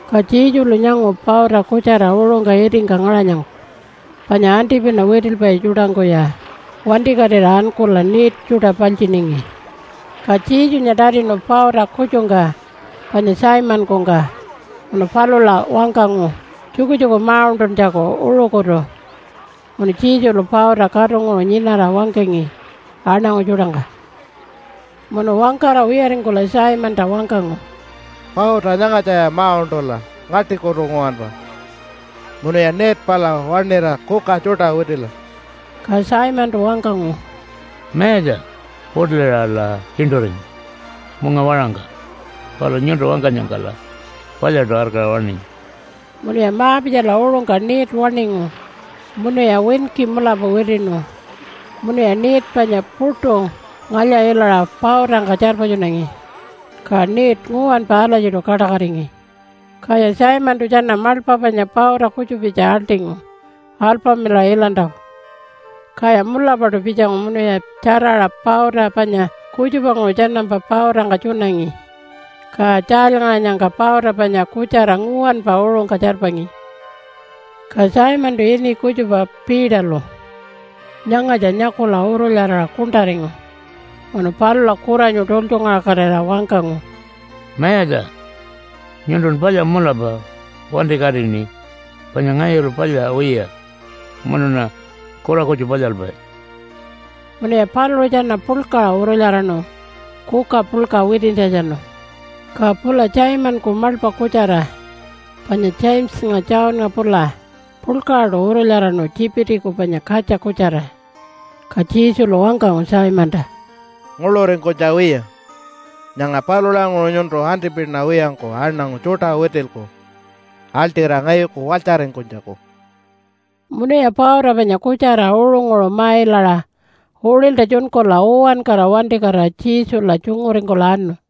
Ka Jesulu nyangu pauta kutjara uṟungka itingka ngaṟanyangka panya antipina witilpai tjuṯangkuya wantikatira ankula net tjuṯa paltjiningi. Ka Jesunya tatinu pauta kutjungka panya Simonkungka munu palula wangkangu tjukutjuku ma-uṉṯuntjaku uṟukutu munu Jesulu pauta katunguṟu nyinara wangkangi aṉangu tjuṯangka. Munu wangkara wiyaringkula Simonta wangkangu, “Pauta nyangatjaya ma-uṉṯula ngaṯikutu nguwanpa munuya net pala waṉira kuka tjuṯa witila.” Ka Simontu wangkangu, “Mayatja, puṯuliṟala tjiṉṯuringu munga waṟangka palu nyuntu wangkanyangkala palyaṯu arkaṟa waṉinyi.” Munuya ma-pitjala uṟungka net waṉingu munuya winki mulapa witiṉu munuya net panya puṯu ngalya-ilaṟa pautangka tjarpatjunangi. Ka net nguwanpa alatjiṯu kaṯakatingi. Kaya Simontu tjana maḻpa panya pauta kutjupitja aḻṯingu alpamilaṟa ilantjaku. Kaya mulapaṯu pitjangu munuya tjaraṟa pauta panya kutjupanguṟu tjanampa pautangka tjunangi. Ka tjaalyngaṟanyangka pauta panya kutjara nguwanpa uṟungka tjarpangi. Ka Simontu ini kutjupa Peterlu nyangatja nyakula urulyaraṟa kuṉṯaringu, munu palula kuranyu tultjungaṟakatira wangkangu, “Mayatja! Nyuntun palya mulapa. Wantikatiṉi panya ngayulu palya wiya munuṉa kura kutju palyalpai.” Munuya paluṟu tjana puḻkaṟa urulyaraṉu kuka puḻka witintjatjanu. Ka pula Simonku maḻpa kutjara panya Jamesanya Johnnga pula puḻkaṟaṯu urulyaraṉu Tjipitiku panya katja kutjara. Ka Jesulu wangkangu Simonta, “Nguḻuringkunytja wiya. Nyanga palulanguṟu nyuntu antipina wiyangku aṉangu tjuṯa witilku aḻṯira ngayuku walytjaringkunytjaku.” Munuya pauta panya kutjara uṟunguṟu ma-ilaṟa uṟilta tjunkula uwankara wantikatira Jesula tjunguringkula anu.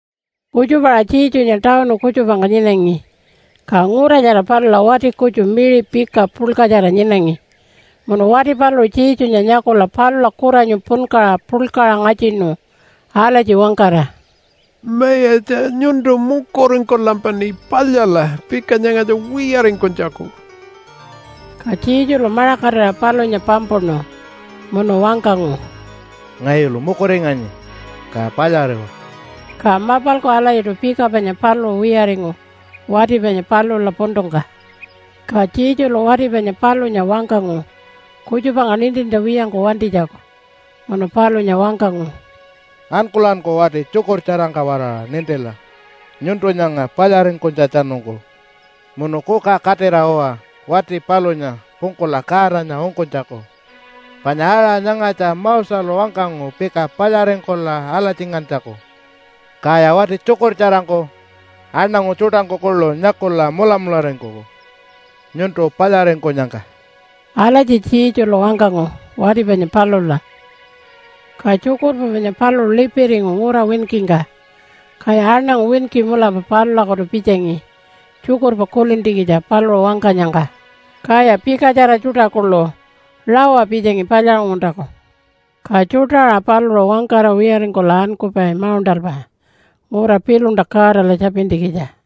Kutjupa ara Jesunya tawunu kutjupangka nyinangi, ka ngura nyara palula wati kutju miṟi pika puḻkatjara nyinangi. Munu wati paluṟu Jesunya nyakula palula kuranyu punkaṟa puḻkaṟa ngatjinu alatji wangkara, “Mayatja nyuntu mukuringkulampaṉi palyala pika nyangatja wiyaringkunytjaku.” Ka Jesulu maṟakatira palunya pampuṉu munu wangkangu, “Ngayulu mukuringanyi, ka palyariwa.” Ka mapalku alatjiṯu pika panya paluṟu wiyaringu wati panya palula puntungka. Ka Jesulu wati panya palunya wangkangu kutjupangka nintintja wiyangku wantinytjaku. Munu palunya wangkangu, “Ankulanku wati tjukurtjarangka-waraṟa nintila nyuntu nyanga palyaringkunytjatjanungku. Munu kuka katira uwa wati palunya pungkula Godanya ungkunytjaku. Panya aṟa nyangatja Moselu wangkangu pika palyaringkula alatjingantjaku. Kaya wati tjukurtjarangku, aṉangu tjuṯangku kuḻu nyakula mulamularingkuku nyuntu palyaringkunyangka.” Alatji Jesulu wangkangu wati panya palula. Ka tjukurpa panya paluṟu lipiringu ngura winkingka. Kaya aṉangu winki mulapa palulakutu pitjangi tjukurpa kulintjikitja paluṟu wangkanyangka. Kaya pikatjara tjuṯa kuḻu rawa pitjangi palyaṟunguntjaku. Ka tjuṯa aṟa paluṟu wangkara wiyaringkula ankupai mauṉṯalpa ngura piḻunta Godala tjapintjikitja.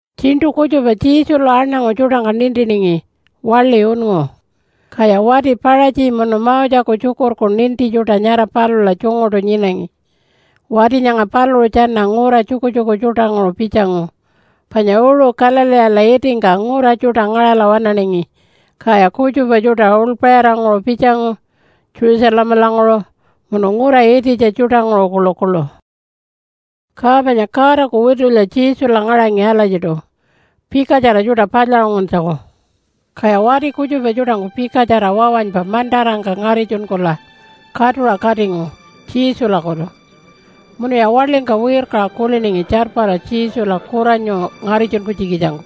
Tjiṉṯu kutjupa Jesulu aṉangu tjuṯangka nintiningi waḻi unngu, kaya wati Paṟatji munu Moseku tjukurku ninti tjuṯa nyara palula tjunguṯu nyinangi. Wati nyanga paluṟu tjana ngura tjukutjuku tjuṯanguṟu pitjangu panya uṟu Galileela itingka ngura tjuṯa ngaṟala waṉaningi. Kaya kutjupa tjuṯa uḻpaṟiranguṟu pitjangu Jerusalemalanguṟu munu ngura ititja tjuṯanguṟu kuḻukuḻu. Ka panya Godaku witulya Jesula ngaṟangi alatjiṯu pikatjara tjuṯa palyaṟunguntjaku. Kaya wati kutjupa tjuṯangku pikatjara wawanypa mantarangka ngaritjunkula katuṟa katingu Jesulakutu. Munuya waḻingka wirkaṟa kuliningi tjarpara Jesula kuranyu ngaritjunkunytjikitjangku.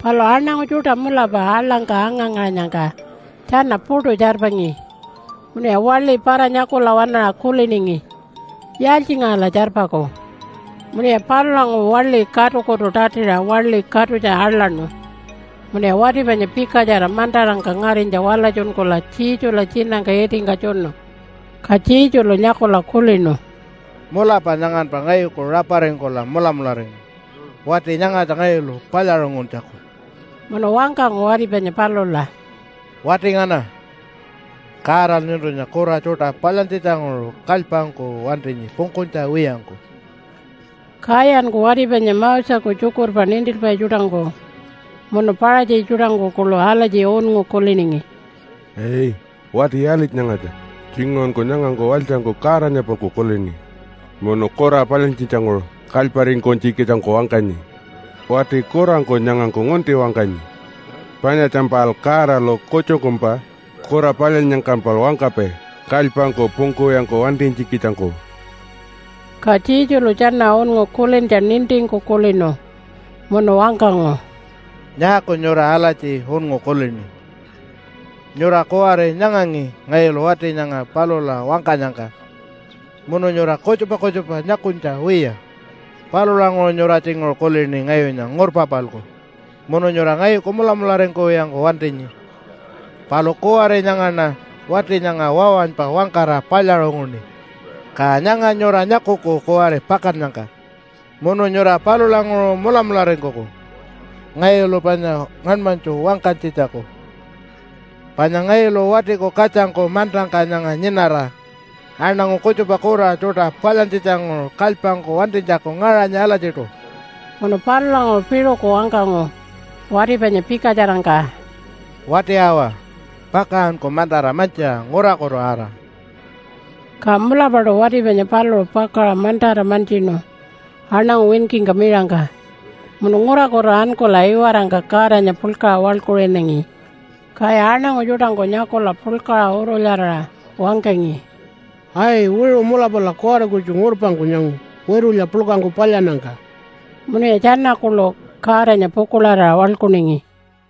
Palu aṉangu tjuṯa mulapa aḻangka anga-ngaṟanyangka tjana puṯu tjarpangi. Munuya waḻi para-nyakula waṉaṟa kuliningi, “Yaaltjingaṟala tjarpaku?” Munuya palulanguṟu waḻi katukutu tatiṟa waḻi katutja aḻaṉu munuya wati panya pikatjara mantarangka ngarinytja walatjunkula Jesula tjinangka itingka tjunu. Ka Jesulu nyakula kulinu, “Mulapa nyanganpa ngayuku raparingkula mulamularingu wati nyangatja ngayulu palyaṟunguntjaku.” Munu wangkangu wati panya palula, “Wati ngana, Godalu nyuntunya kura tjuṯa palyantjitjanguṟu kalypangku wantinyi pungkunytja wiyangku.” Kayanku wati panya Moseku tjukurpa nintilpai tjuṯangku munu Paṟatji tjuṯangku kuḻu alatji unngu kuliningi, “Ai! Wati yaalitja nyangatja? Tjinguṟunku nyangangku walytjangku Godanya-palku kulini munu kura palyantjitjanguṟu kalyparingkunytjikitjangku wangkanyi. Wati kurangku nyangangku ngunti wangkanyi. Panyatjampal Godalu kutjungkumpa kura palyannyangkampal wangkapai kalypangku pungkuwiyangku wantinytjikitjangku.” Ka Jesulu tjana unngu kulintja nintingku kulinu munu wangkangu, “Nyaaku nyura alatji unngu kulini? Nyura kuwari nyangangi ngayulu wati nyanga palula wangkanyangka munu nyura kutjupa kutjupa nyakunytja wiya. Palulanguṟu nyura tjinguṟu kulini ngayunya ngurpa-palku, munu nyura ngayuku mulamularingkuwiyangku wantinyi. Palu kuwari nyangaṉa wati nyanga wawanypa wangkara palyaṟunguṉi. Ka nyanga nyura nyakuku kuwari pakannyangka, munu nyura palulanguṟu mulamularingkuku, ngayulu panya ngaṉmanytju wangkanytjitjaku, panya ngayulu Watiku Katjangku mantangka nyanga nyinara, aṉangu kutjupa kura tjuṯa palyantjitjanguṟu kalypangku wantinytjaku ngaṟanyi alatjiṯu.” Munu palulanguṟu piṟuku wangkangu wati panya pikatjarangka, “Wati awa, pakaṟanku mantara mantjiṟa ngurakutu ara.” Ka mulapaṯu wati panya paluṟu pakaṟa mantara mantjinu aṉangu winkingka miṟangka, munu ngurakutu ankula iwarangka Godanya puḻkaṟa waḻkuṟinangi. Kaya aṉangu tjuṯangku nyakula puḻkaṟa urulyaraṟa wangkangi, “Ai, wiṟu mulapala kuwari kutju ngurpangku nyangu witulya puḻkangku palyannyangka.” Munuya tjana kuḻu Godanya pukuḻarira waḻkuningi.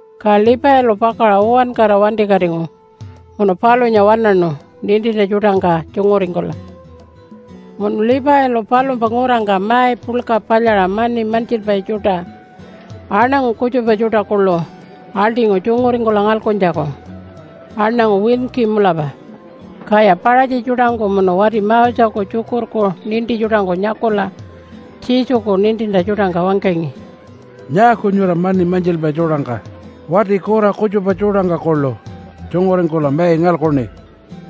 Ka Levilu pakaṟa uwankara wantikatingu munu palunya waṉaṉu nintintja tjuṯangka tjunguringkula. Munu Levilu palumpa ngurangka mai puḻka palyaṟa mani mantjilpai tjuṯa, aṉangu kutjupa tjuṯa kuḻu, aḻṯingu tjunguringkula ngalkuntjaku, aṉangu winki mulapa. Kaya Paṟatji tjuṯangku munu wati Moseku tjukurku ninti tjuṯangku nyakula Jesuku nintintja tjuṯangka wangkangi, “Nyaaku nyura mani mantjilpai tjuṯangka wati kura kutjupa tjuṯangka kuḻu tjunguringkula mai ngalkuṉi?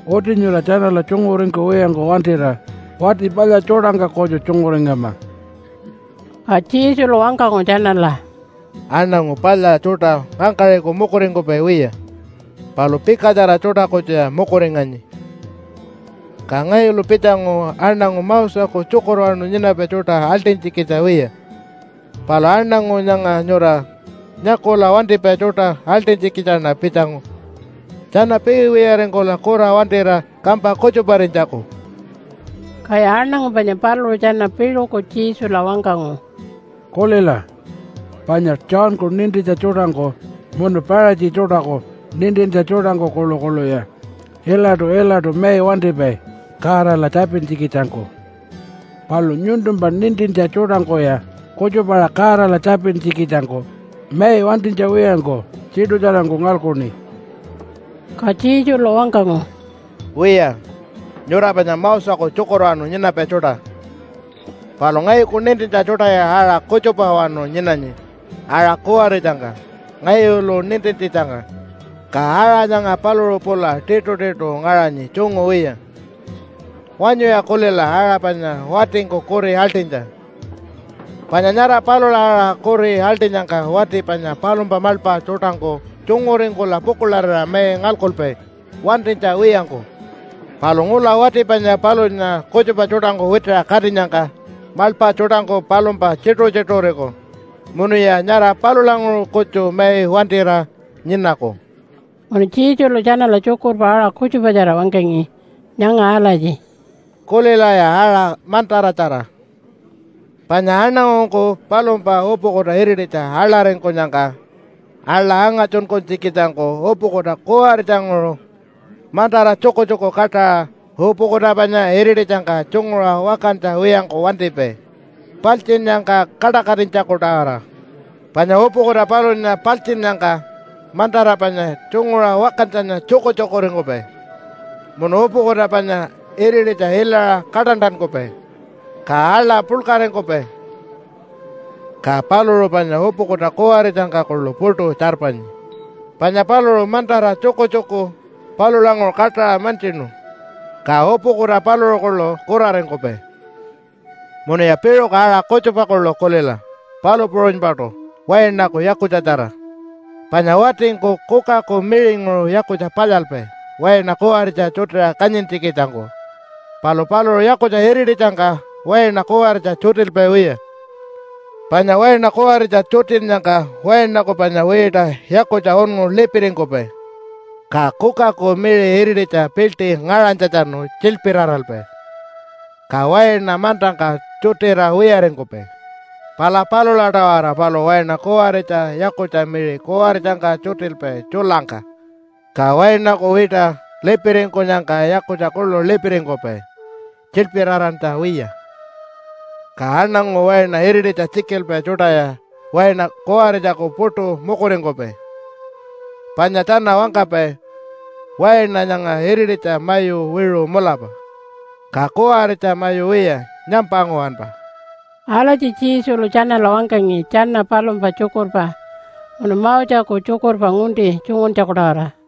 Uti nyura tjanala tjunguringkuwiyangku wantira wati palya tjuṯangka kutju tjunguringama.” Ka Jesulu wangkangu tjanala, “Aṉangu palya tjuṯa ngangkaṟiku mukuringkupai wiya, palu pikatjara tjuṯa kutjuya mukuringanyi. Ka ngayulu pitjangu aṉangu Moseku tjukurwanu nyinapai tjuṯa aḻṯinytjikitja wiya, palu aṉangu nyanga nyura nyakula wantipai tjuṯa aḻṯinytjikitjaṉa pitjangu tjana piiwiyaringkula kura wantira kampa kutjuparinytjaku.” Kaya aṉangu panya paluṟu tjana piṟuku Jesula wangkangu, “Kulila, panya Johnku nintintja tjuṯangku munu Paṟatji tjuṯaku nintintja tjuṯangku kuḻukuḻuya ilaṯu-ilaṯu mai wantipai Godala tjapintjikitjangku, palu nyuntumpa nintintja tjuṯangkuya kutjupa-aṟa Godala tjapintjikitjangku mai wantinytja wiyangku tiṯutjarangku ngalkuṉi.” Ka Jesulu wangkangu, “Wiya, nyura panya Moseku tjukurwanu nyinapai tjuṯa, palu ngayuku nintintja tjuṯaya aṟa kutjupawanu nyinanyi aṟa kuwaritjangka ngayulu nintintjitjangka, ka aṟa nyanga paluṟu pula tiṯutiṯu ngaṟanyi tjungu wiya. Wanyuya kulila aṟa panya watingku kuri aḻṯinytja, panya nyara palula aṟa kuri aḻṯinyangka wati panya palumpa maḻpa tjuṯangku tjunguringkula pukuḻarira mai ngalkupai wantinytja wiyangku. Palu ngula wati panya palunya kutjupa tjuṯangku witiṟa katinyangka maḻpa tjuṯangku palumpa tjituṟu-tjituṟuriku munuya nyara palulanguṟu kutju mai wantira nyinaku.” Munu Jesulu tjanala tjukurpa aṟa kutjupatjara wangkangi nyanga alatji, “Kulilaya aṟa mantaratjara! Panya aṉangungku palumpa upukuta irititja aḻaringkunyangka, aḻa angatjunkunytjikitjangku upukuta kuwaritjanguṟu, mantara tjukutjuku kaṯaṟa, upukuta panya irititjangka tjunguṟa wakantja wiyangku wantipai, paltjinnyangka kaṯakatinytjaku-tawara. Panya upukuta palunya paltjinnyangka mantara panya tjunguṟa wakantjanya tjukutjukuringkupai, munu upukuta panya irititja ilaṟa kaṯantankupai, ka aḻa puḻkaringkupai. Ka paluṟu panya upukuta kuwaritjangka kuḻu puṯu tjarpanyi, panya paluṟu mantara tjukutjuku palulanguṟu kaṯaṟa mantjinu, ka upukuta paluṟu kuḻu kuraringkupai. “Munuya piṟuku aṟa kutjupa kuḻu kulila palu puṟunypaṯu wainaku yakutjatjara. Panya watingku kukaku miṟinguṟu yakutja palyalpai waina kuwaritja tjutiṟa kanyintjikitjangku. Palu paluṟu yakutja irititjangka waina kuwaritja tjutilpai wiya, panya waina kuwaritja tjutinnyangka wainaku panya wiṯa yakutja unngu lipiringkupai, ka kukaku miṟi irititja piḻṯi ngaṟanytjatjanu tjilpiraralpai, ka waina mantangka tjutira wiyaringkupai. Pala palula-tawara paluṟu waina kuwaritja yakutja miṟi kuwaritjangka tjutilpai tjulangka, ka wainaku wiṯa lipiringkunyangka yakutja kuḻu lipiringkupai tjilpirarantja wiya. “Ka aṉangu waina irititja tjikilpai tjuṯaya waina kuwaritjaku puṯu mukuringkupai, panya tjana wangkapai, ‘Waina nyanga irititja mayu wiṟu mulapa, ka kuwaritja mayu wiya, nyampa nguwanpa.’” Alatji Jesulu tjanala wangkangi tjana palumpa tjukurpa munu Moseku tjukurpa ngunti tjunguntjaku-tawara.